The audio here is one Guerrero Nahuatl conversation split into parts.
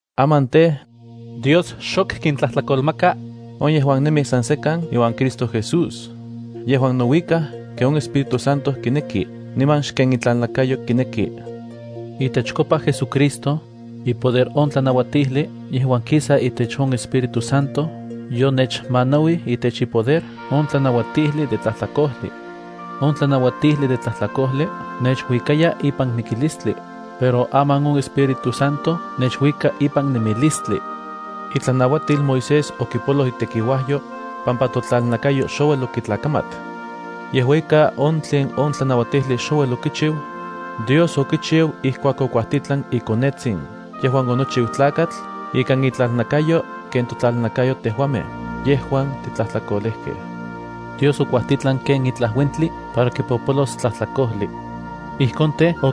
Aman tej, Dios xok kintlajtlakolmaka on yejuan nemij san sekan iuan Cristo Jesús, yejuan nouikaj ken on Espíritu Santo kineki niman xken intlalnakayo kineki. Itechkopa JesuCristo, ipoder on tlanauatijli yejuan kisa itech on Espíritu Santo yonechmanauij itech ipoder on tlanauatijli de tlajtlakojli. On tlanauatijli de tlajtlakojli nechuikaya ipan mikilistli, pero aman on Espíritu Santo nechuika ipan nemilistli. Itlanauatil Moisés okipoloj itekiuajyo pampa totlalnakayo xouel okitlakamat. Yejua ika, on tlen on tlanauatijli xouel okichiu, Dios okichiu ijkuak okuajtitlan iKonetsin yejuan onochiu Tlakatl ikan itlalnakayo ken totlalnakayo tejuamej yejuan titlajtlakolejkej. Dios okuajtitlan ken itlaj uentli para kipopolos tlajtlakojli. Ijkon tej,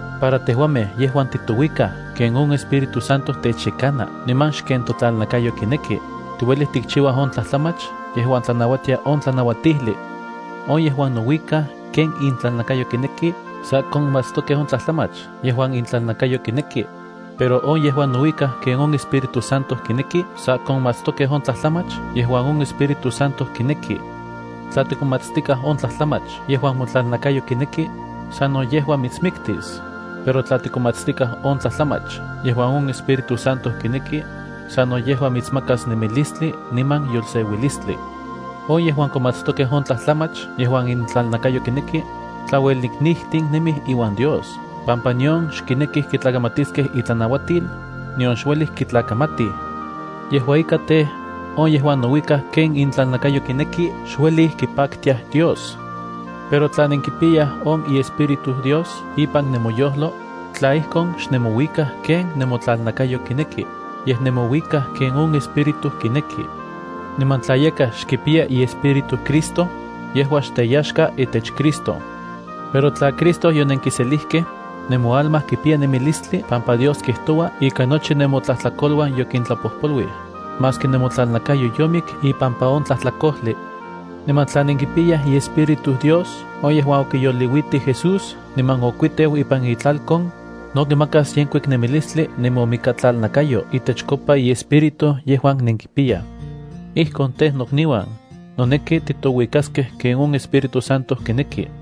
para tejuamej yejuan titouikaj ken on Espíritu Santo techyakana, niman xken totlalnakayo kineki, tiuelij tikchiuaj on tlajtlamach yejuan tlanauatia on tlanauatijli. On yejuan nouikaj ken intlalnakayo kineki sa konmatstokej on tlajtlamach yejuan intlalnakayo kineki, pero on yejuan nouikaj ken on Espíritu Santo kineki, sa konmatstokej on tlajtlamach yejuan on Espíritu Santo kineki. Tla tikomatstikaj on tlajtlamach yejuan motlalnakayo kineki, sano yejua mitsmiktis, pero tla tikomatstikaj on tlajtlamach yejuan on Espíritu Santo kineki, sano yejua mitsmakas nemilistli niman yolseuilistli. On yejuan konmatstokej on tlajtlamach yejuan intlalnakayo kineki, tlaueliknijtin nemij iuan Dios pampa nion xkinekij kitlakamatiskej itlanauatil, nion xuelij kitlakamatij. Yejua ika tej, on yejuan nouikaj ken intlalnakayo kineki xueli kipaktiaj Dios. Pero tla nenkipiyaj on iEspíritu Dios ipan nemoyojlo, tla ijkon, xnemouikaj ken nemotlalnakayo kineki, yej nemouikaj ken on Espíritu kineki. Niman tla yakaj xkipiya iEspíritu Cristo, yejua xteyaxka itech Cristo. Pero tla Cristo yonenkiselijkej, nemoalma kipiya nemilistli pampa Dios kijtoua ika nochi nemotlajtlakoluan yokintlapojpoluij, maski nemotlalnakayo yomik ipampa on tlajtlakojli. Niman tla nenkipiyaj iEspíritu Dios on yejuan okiyoliuitij Jesús niman okikuiteu ipan itlalkon, no kimakas yenkuik nemilistli nemomikatlalnakayo itechkopa iEspíritu yejuan nenkipiyaj. Ijkon tej, nokniuan, noneki titouikaskej ken on Espíritu Santo kineki,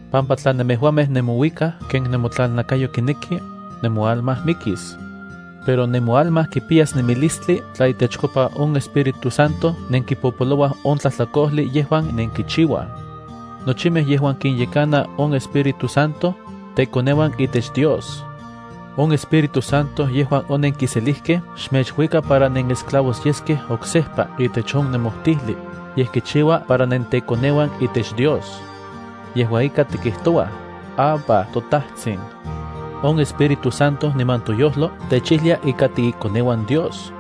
pampa tla nemejuamej nemouikaj ken nemotlalnakayo kineki, nemoalma mikis. Pero nemoalma kipiyas nemilistli tla itechkopa on Espíritu Santo nenkipopolouaj on tlajtlakojli yejuan nenkichiuaj. Nochimej yejuan kinyekana on Espíritu Santo, tekoneuan itech Dios. On Espíritu Santo yejuan onenkiselijkej xmechuika para nenesclavos yeskej oksejpa itech on nemojtijli, yej kichiua para nentekoneuan itech Dios. Yejua ika, tikijtouaj: “Abba, toTajtsin.” On Espíritu Santo niman toyojlo techijlia ika tiikoneuan Dios.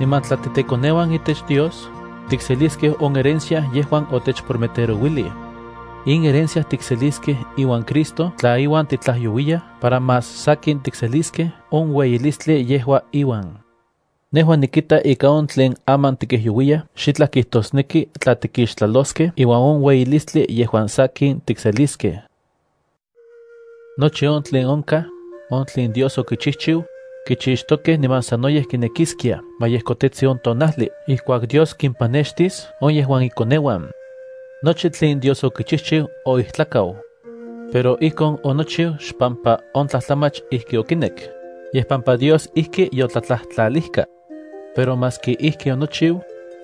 Niman tla titekoneuan itech Dios, tikseliskej on herencia yejuan otechprometerouilij. In herencia tikseliskej iuan Cristo tla iuan titlajyouiyaj para más sakin tikseliskej on ueyilistli yejua iuan. Nejua nikita ika on tlen aman tikijyouiyaj xitlaj kijtosneki tla tikixtlaloskej iuan on ueyilistli yejuan sakin tikseliskej. Nochi on tlen onkaj, on tlen Dios okichijchiu, kichixtokej niman sanoyej kinekiskiaj ma yejkotetsi on tonajli ijkuak Dios kimpanextis on yejuan ikoneuan. Nochi tlen Dios okichijchiu oijtlakau. Pero ijkon onochiu xpampa on tlajtlamach ijki okinek, yej pampa Dios ijki yotlatlajtlalijka. Pero maski ijki onochiu,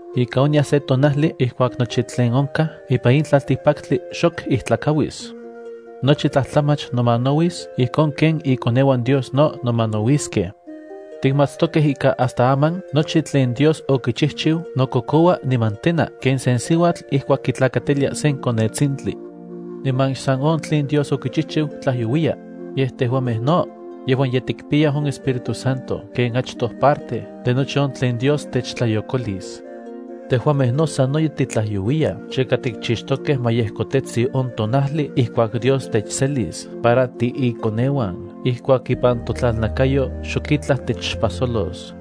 ika onyas se tonajli ijkuak nochi tlen onkaj ipan in tlaltikpaktli xok ijtlakauis. Nochi tlajtlamach nomanauis ijkon ken ikoneuan Dios no nomanauiskej. Tikmatstokej ika hasta aman nochi tlen Dios okichijchiu nokokoua niman tena ken sen siuatl ijkuak kitlakatilia sen konetsintli. Niman xsan on tlen Dios okichijchiu tlajyouiya, yej tejuamej no yejuan ye tikpiyaj on Espíritu Santo ken achtoj parte de nochi on tlen Dios techtlayokolis. Tejuamej no sanoyej titlajyouiyaj chika tikchixtokej ma yejkotetsi on tonajli ijkuak Dios techselis para tiikoneuan ijkuak ipan totlalnakayo xok itlaj techpajsolos.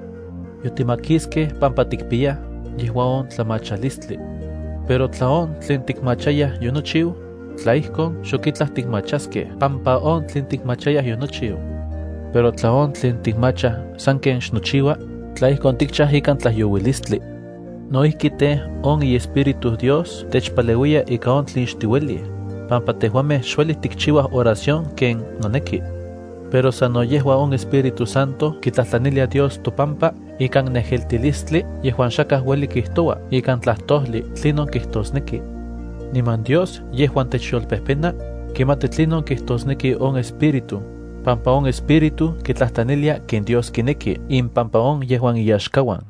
Yotimakiskej pampa tikpiyaj yejua on tlamachalistli. Pero tla on tlen tikmachayaj yonochiu, tla ijkon, xok itlaj tikmachaskej pampa on tlen tikmachayaj yonochiu. Pero tla on tlen tikmachaj sanken xnochiua, tla ijkon tikchaj ikan tlajyouilistli. No ijki tej, on iEspíritu Dios techpaleuiya ika on tlen xtiuelij, pampa tejuamej xueli tikchiuaj oración ken noneki. Pero sano yejua on Espíritu Santo kitlajtlanilia Dios topampa ikan nejeltilistli yejuan xakaj ueli kijtoua ikan tlajtojli tlinon kijtosneki. Niman Dios, yejuan techyolpejpena, kimati tlinon kijtosneki on Espíritu, pampa on Espíritu kitlajtlanilia ken Dios kineki impampa on yejuan iyaxkauan.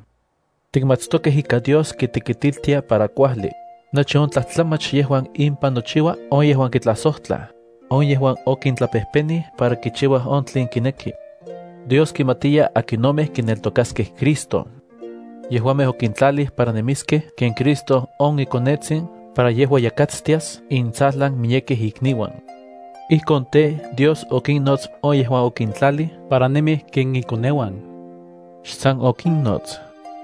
Tikmatstokej ika Dios kitekitiltia para kuajli, nochi on tlajtlamach yejuan impan nochiua on yejuan kitlajsojtlaj, on yejuan okintlapejpenij para kichiuaj on tlen kineki. Dios kimatiya akinomej kineltokaskej Cristo. Yejuamej okintlalij para nemiskej ken Cristo on iKonetsin para yejua yakatstias intsajlan miyekej ikniuan. Ijkon tej, Dios okinnots on yejuan okintlalij para nemiskej ken iKonetsin. Xsan okinnots,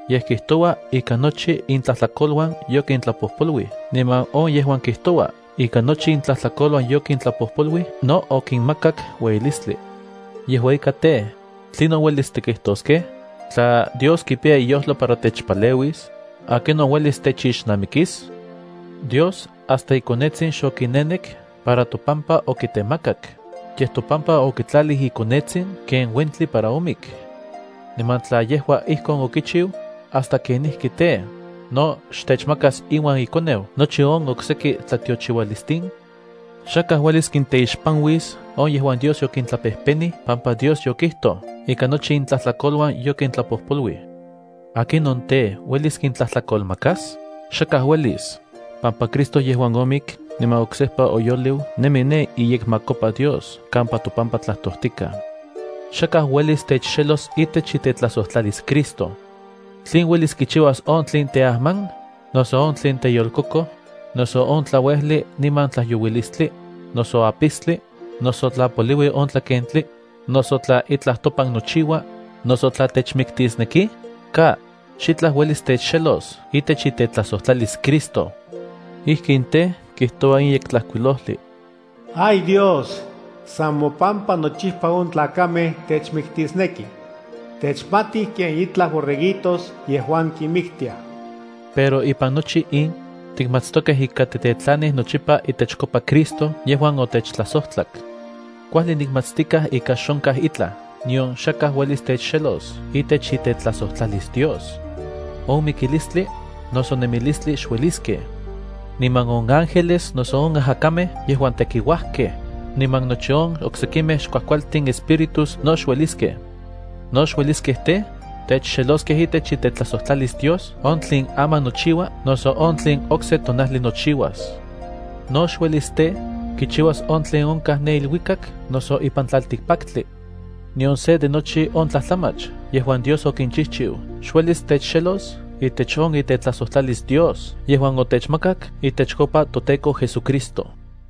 yej kijtoua ika nochi intlajtlakoluan yokintlapojpoluij niman on yejuan kijtoua ika nochi intlajtlakoluan yokintlapopoluij no okinmakakak ueyilistli. Yejua ika tej, ¿tlinon uelis tikijtoskej? Tla Dios kipiya iyojlo para techpaleuis, ¿akinon uelis techixnamikis? Dios, hasta iKonetsin xokinenek para topampa okitemakak, yej topampa okitlalij iKonetsin ken uentli para omik. Niman tla yejua ijkon okichiu, ¿hasta kenijki tej, no xtechmakas iuan iKoneu nochi on okseki tlatiochiualistin? Xakaj uelis kinteixpanuis on yejuan Dios yokintlapejpenij pampa Dios yokijtoj ika nochi intlajtlakoluan yokintlapojpoluij. ¿Akinon tej, uelis kintlajtlakolmakas? Xakaj uelis pampa Cristo yejuan omik niman oksejpa oyoliu nemi ne iyekmakopa Dios kampa topampa tlajtojtikaj. Xakaj uelis techxelos itech itetlajsojtlalis Cristo. ¿Tlen uelis kichiuas on tlen teajman, noso on tlen teyolkokoj, noso on tlauejli niman tlajyouilistli, noso apistli, noso tla poliui on tlakentli, noso tla itlaj topan nochiua, noso tla techmiktisnekij? ¡Ka! Xitlaj uelis techxelos itech itetlajsojtlalis Cristo. Ijkin tej, kijtoua in Yektlajkuilojli: Ay Dios, san mopampa nochipa on tlakamej techmiktisnekij. Techmatij ken itlaj borreguitos yejuan kinmiktiaj. Pero ipan nochi in, tikmatstokej ika titetlanij nochipa itechkopa Cristo yejuan otechtlajsojtlak. Kuajli nikmatstikaj ika xonkaj itlaj nion xakaj uelis techxelos itech itetlajsojtlalis Dios. On mikilistli, noso nemilistli xueliskej. Niman on ángeles noso on ajakamej yejuan tekiuajkej, niman nochi on oksekimej xkuajkualtin espíritus no xueliskej. No xueliskej tej, techxeloskej itech itetlajsojtlalis Dios on tlen aman nochiua noso on tlen okse tonajli nochiuas. No xuelis tej, kichiuas on tlen onkaj ne iluikak noso ipan tlaltikpaktli. Nion se de nochi on tlajtlamach yejuan Dios okinchijchiu xuelis techxelos itech on itetlajsojtlalis Dios yejuan otechmakak itechkopa toTEKO JesuCristo.